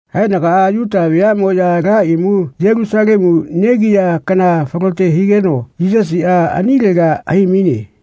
Haenagaꞌa Yuta veaꞌmoꞌya ala imu Yelusalemu negiya kana falote higeno Yisasiꞌa anilega hai-maine.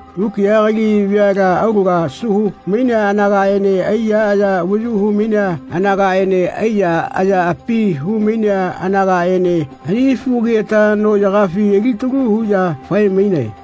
Mukiꞌa kali veala aulaga asu hu-mai anagaꞌene aiya avayu hu-mainea anagaꞌene aiyaꞌaya api hu-mai anagaꞌene ani fugagiꞌeta noꞌyagafi alitalu huꞌya fae-mainae.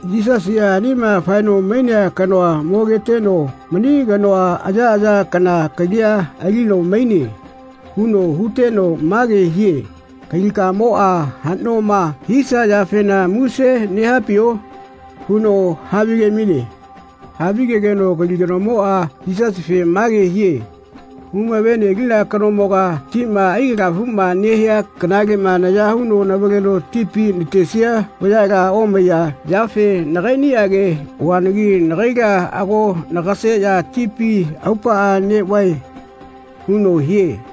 Yisasiꞌa anima faeno mainea kanoa mogeteno “Mani kanoa ayaꞌaya kana kalia alino maine.” huno huteno mage hie “Kalikamoꞌma haꞌnoma hisia yafena muse nehapio?” huno havige-maine. Havigegeno kali kanomoꞌa Yisasife mage hie “Humave-nelina kanomoga tima aikalafuꞌma nehia kanaleꞌma naya huno navaleno tipi natesia vayala omaiya yafe nagaiꞌnige oanagi nagaila ago nagaseꞌya tipi aupaꞌa neꞌvae.” huno hie.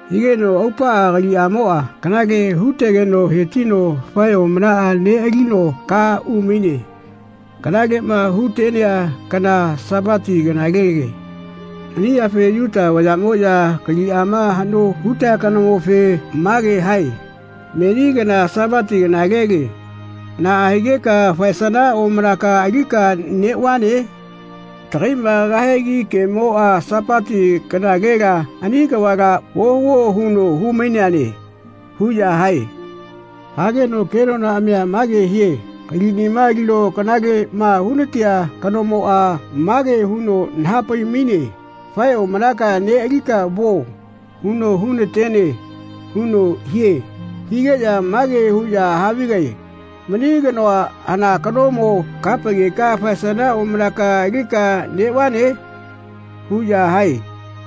Higeno aupaꞌa kaliꞌamoꞌa kanale hu-tegeno hetino fae omanaꞌa neꞌalino ka umaine. Kanaleꞌma hu-tenea kana Sapati kanalele. Ani yafe Yuta vayaꞌmoꞌya kaliꞌama haꞌno hutea kanomofe mage hae “Meni kana Sapati kanalele. Naꞌa higeka faesana omanaka alika neꞌvane? Tagaiꞌma kahegi kemoꞌa Sapati kanalela ani kavala ohuo huno hu-maineane.” huꞌya hae. Hageno kenonaꞌamia mage hie “Kaliꞌniꞌa alino kanaleꞌma hu-na-tea kanomoꞌa mage huno naha-pai-maine ‘Fae omanakaꞌa neꞌalika vuo.’ huno hu-na-tene.” huno hie Higeꞌya mage huꞌya havigae “Mani kanoa hana kanomo kaha-paigeka faesana omanaka alika neꞌvane?” huꞌya hae.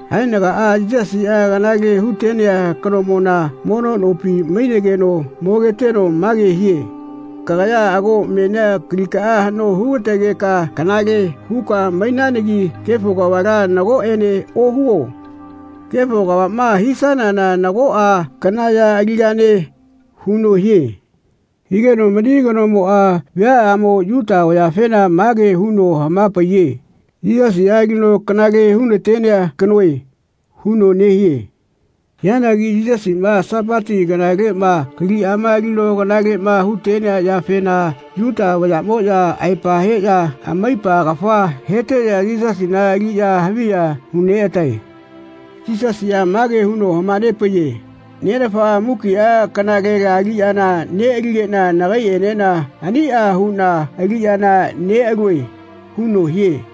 Haenagaꞌa Yisasiꞌa kanale hu-tenea kanomona mono nopi mainegeno mogeteno mage hie “Kagaya ago menia kalikaꞌa haꞌno hu-ga-tegeka kanale huka mainanagi kefo kavala nagoꞌene ohuo. Kefo kavaꞌma hisanana nagoꞌa kana ya aligane.” huno hie. Higeno mani kanomoꞌa viaꞌyamo Yuta vayafena mage huno hama-paiye “Yisasiꞌa alino kanale hu-natenea kanoe.” huno nehie. Hianagi Yisasiꞌma Sapati kanaleꞌma kaliꞌama alino kanaleꞌma hu-tenea yafena Yuta vayaꞌmoꞌya aepa heꞌya amaipa kafa heteꞌya Yisasina aliꞌya haviꞌya hu-neꞌatae. Yisasiꞌa mage huno hama-nepaiye “Nenafaꞌa mukiꞌa kanalela aliꞌyana neꞌaligeꞌna nagaiꞌenena aniꞌa huꞌna aliꞌyana neꞌalue.” huno hie.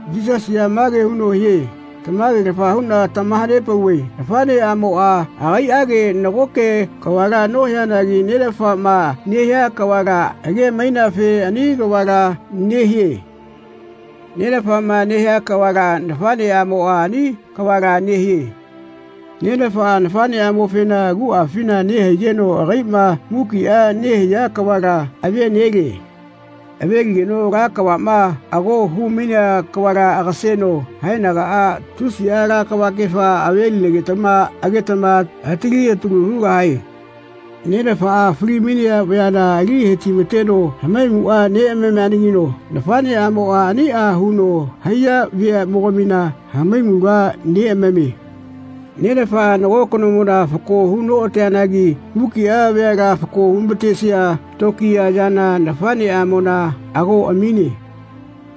Yisasiꞌa mage huno hie “Tamage-lafa huꞌna tamaha-nepauve Nafaꞌneꞌamoꞌa agaiꞌage nagoke kavala nohianagi Nenafaꞌma nehia kavala age-maineafe ani kavala nehie. Nenafaꞌma nehia kavala Nafaꞌneꞌamoꞌa ani kavala nehie. Nenafaꞌa Nafaꞌneꞌamofena aguꞌafina nehaigeno agaiꞌma mukiꞌa nehia kavala ave-nelie. Ave-ligeno ala kavaꞌma ago hu-mainea kavala agaseno haenagaꞌa tusiꞌa ala kavakefa ave-linegetama agetama atali atalu hugahae. Nenafaꞌa fali-mainea vayala ali he-ti-mateno hamaimuꞌa neꞌamamianagino Nafaꞌneꞌamoꞌa aniꞌa huno haiya veaꞌmogamina hamaimula neꞌamamie. Nenafaꞌa nago kanomona fako hu noꞌateanagi mukiꞌa veala fako hu-ma-tesia tokiya yana Nafaꞌneꞌamona ago amine.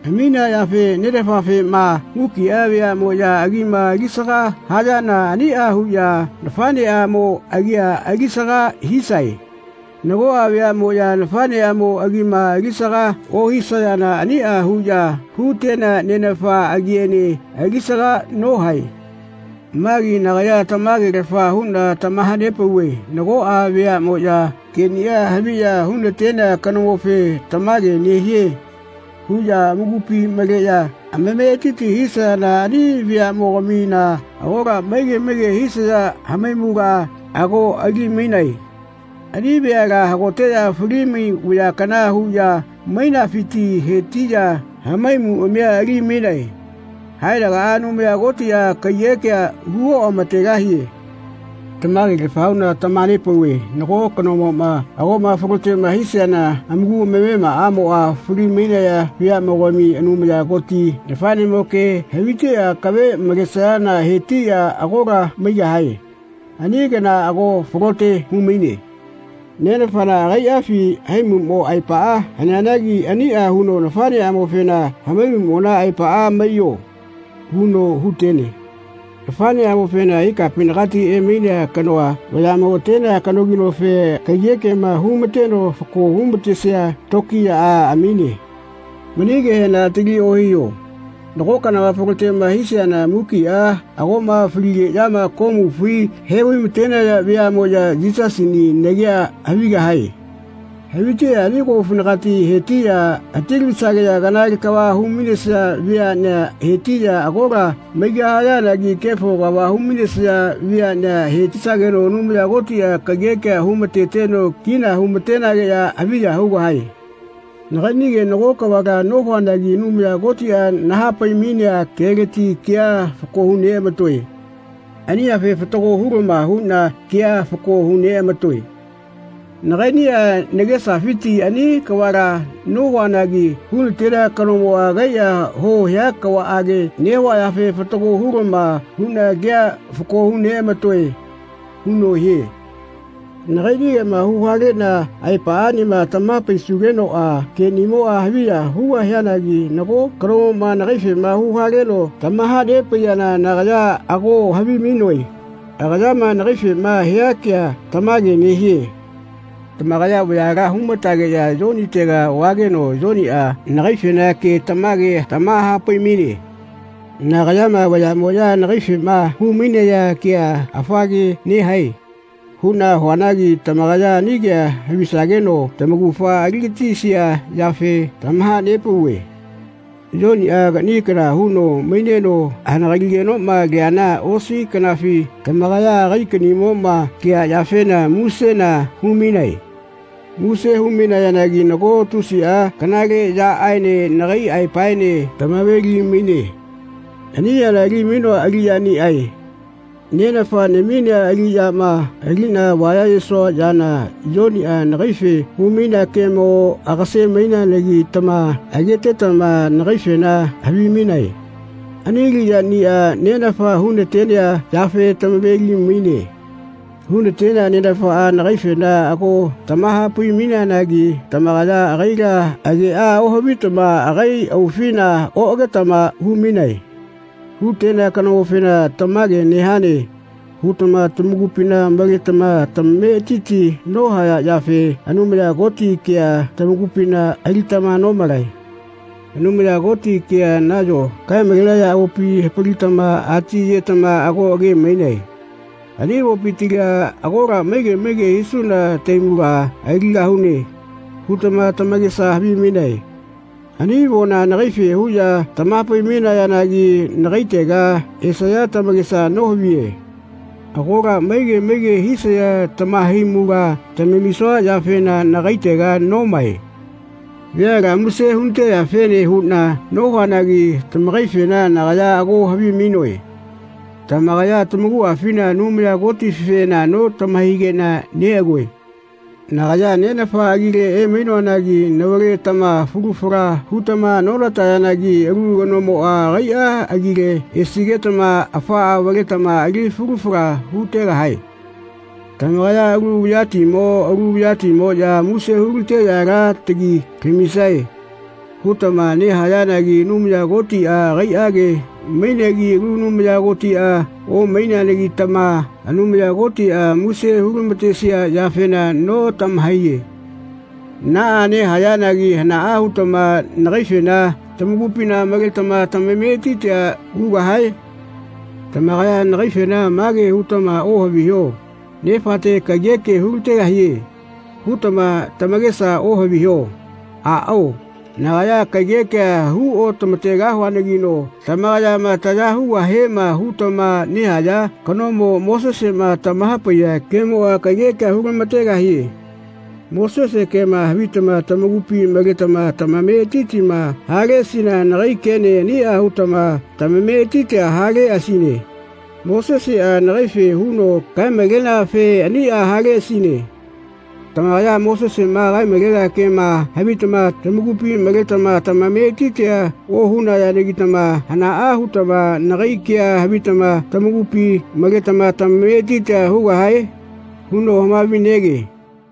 Aminea yafe Nenafafema mukiꞌa veaꞌmoꞌya agima alisaga hayana aniꞌa huꞌya Nafaꞌneꞌamo agia alisaga hisae. Nagoꞌa veaꞌmoꞌya Nafaꞌneꞌamo agima alisaga ohisayana aniꞌa huꞌya hu-tenea Nenafa agiene alisaga nohae. Magi nagaya tamage-lafa huꞌna tamaha-pauve nagoꞌa veaꞌmoꞌya keꞌniꞌa haviꞌya hu-natenea kanomofe ‘Tamage nehie.’ huꞌya amakupi maleꞌya amametiti hisayana ani veaꞌmogamina agola maige maige hisaya hamaimula ago ali-mainae. Ani veala hagoteꞌya fali-mai vaya kana huꞌya mainafiti hetiꞌya hamaimuꞌamia ali-mainae. Haenagaꞌa Anumaya Kotiꞌa kaiyeꞌkea hu oꞌama-tegahie. Tamage-lafa huꞌna tamaha-nepauve nago kanamoꞌma agoꞌma falote hisiana amaku amamemaꞌamoꞌa fali-mainaya veaꞌmoꞌya Anumaya Koti nafaꞌnemo ke haviteꞌya akave malesayana he-tiꞌya agola maigahae. Ani kana ago falote hu-maine. Nenafana agaiꞌafi haimuꞌmo aepa haneanagi aniꞌa huno Nafaꞌneꞌamofena ‘Hamaimuꞌmona aepaꞌa maiyo.’ huno hu-tene. Nafaꞌneꞌamofena ikapinagati emainea kanoa vayaꞌmo atenea kanoginofe kaiyeꞌkema hu-ma-teno fako hu-ma-tesia tokiyaꞌa amine. Mani kehena atali ohiho. Nago kana falote hisiana mukiꞌa agoꞌma faligeꞌyama komufi he-vai-matenaya veaꞌmoꞌya Yisasini nagea havigahae. Haviteꞌya ani komufinagati he-tiꞌya hati-lavisageꞌya kanale kava hu-mainesaya veaꞌnea hetiꞌya agola maigahayanagi kefo kava hu-mainesaya veaꞌnea he-tisageno Anumaya Kotiꞌa kaiyeꞌkea hu-ma-teteno kina hu-ma-tenageꞌya haviya hugahae. Nagaiꞌnige nago kavala nohuanagi Anumaya Kotiꞌa nahapai-mainea keleti kea fako hu-neꞌama-toe. Ani yafe fatago hulama huꞌna kea fako hu-neꞌama-toe. Nagaiꞌniꞌa nagesafiti ani kavala nohuanagi hu-na-tenea kanomoꞌa agaiꞌa huo hea kavaꞌage nehua yafe fatago hu-lama huꞌna kea fako hu-neꞌama-toe.” huno hie. “Nagaiꞌnigeꞌma hu-haleꞌna aepaꞌaꞌnima tamaha-paisugenoꞌa keꞌnimoꞌa haviya hugahianagi nago kanomoꞌma nagaifema hu-haleno tamaha-nepaiyana nagaya ago havimainoe agayama nagaifema hia kea tamage nehie. Tamakaya vayala hu-matageꞌya Yonitega vageno Yoniꞌa nagaifena ke tamage tamaha-pai-maine. Nagayama vayaꞌmoꞌya nagaifema hu-mainaya kea ‘Afa ke nehae.’ huꞌna huanagi tamakaya ani kea havisageno tamaugafa ali-gatisia yafe tamaha-nepauve. Yoniꞌa kaꞌni kana huno maineno hanagaligenoꞌma leana osi kanafi tamakaya agai kaꞌniꞌmoꞌma lea yafena musena hu-mainae. Muse hu-mainayanagi nago tusiꞌa kanale yaꞌaene nagai aepaene tamave-li-maine. Ani yana ali-mainoa aliꞌyaniꞌae. Nenafa naminea aliꞌyama aliꞌna avaya-yesua yana Yoniꞌa nagaife hu-mainea kemo agase-mainegetama agetetama nagaifena havimainae. Ani aliꞌyaꞌniꞌa Nenafa hu-na-tenea yafe tamave-li-maine. Hu-na-tenea Nenafaꞌa nagaifena ago tamaha-pai-maineanagi tamakaya agaila ageꞌa ohavitama agai aufina oꞌagetama hu-mainae. Hu-tenea kanomofena ‘Tamage nehane.’ hutama tamakupina maletama tamametiti nohaya yafe Anumaya Koti kea tamakupina alitama nomalae. Anumaya Koti kea nayo kae-malenaya avopi hapalitama ati-yetama ago age-mainae. ‘Ani avopitila agola maige maige hisuna tahaimula aligahune.’ hutama tamakesa havimainae. Ani avona nagaife huꞌya tamaha-pai-mainayanagi nagaitega esaya tamakesa nohaviye. Agola maige maige hisaya tamahaimula tamamisua yafena nagaitega nomae. Veala muse hu-na-teyafene huꞌna nohuanagi tamakaifena nagaya ago havimainoe. Tamakaya tamakuꞌafina Anumaya Kotifena notama-haikeꞌna neꞌagoe. Nagaya Nenafa agile emainoanagi navaletama falu fala hutama nonatayanagi alu kanomoꞌa agaiꞌa agile esigetama afaꞌa avaletama ali falu fala hutegahae. Tamakaya ‘Alu vayatimo alu vayatimoꞌya muse hu-lateꞌya ala tagi lamisae.’ hutama nehayanagi Anumaya Kotiꞌa agaiꞌage mainegi alu Anumaya Kotiꞌa omaineanagitama Anumaya Kotiꞌa muse hu-lama-tesia yafena notamahaiye. Naꞌa nehayanagi hanaꞌa hutama nagaifena tamakupina maletama tamametitia hugahae? Tamakaya nagaife ma ke hutama ohaviho ‘Nefate kaiyekea hu-la-tegahie.’ hutama tamakesa ohaviho. Aꞌao, nagaya kaiyekea hu otama-tegahuanagino tamakayama taya hugahiema hutama nehaya kanomo, Moseseꞌma tamaha-paiya kemoꞌa kaiyekea hu-lama-tegahie. Mosese kema havitama tamakupi maletama tamametitima haleꞌasina nagai kene aniꞌa hutama tamametitia haleꞌasine. Moseseꞌa nagaife huno kae-maleneafe aniꞌa haleꞌasine. Tamakaya Moseseꞌma kae-malenea kema havitama tamakupi maletama tamametitia ohunayanagitama hanaꞌa hutama nagai ke havitama tamakupi maletama tamametiti hugahae?” huno hamavi-nege.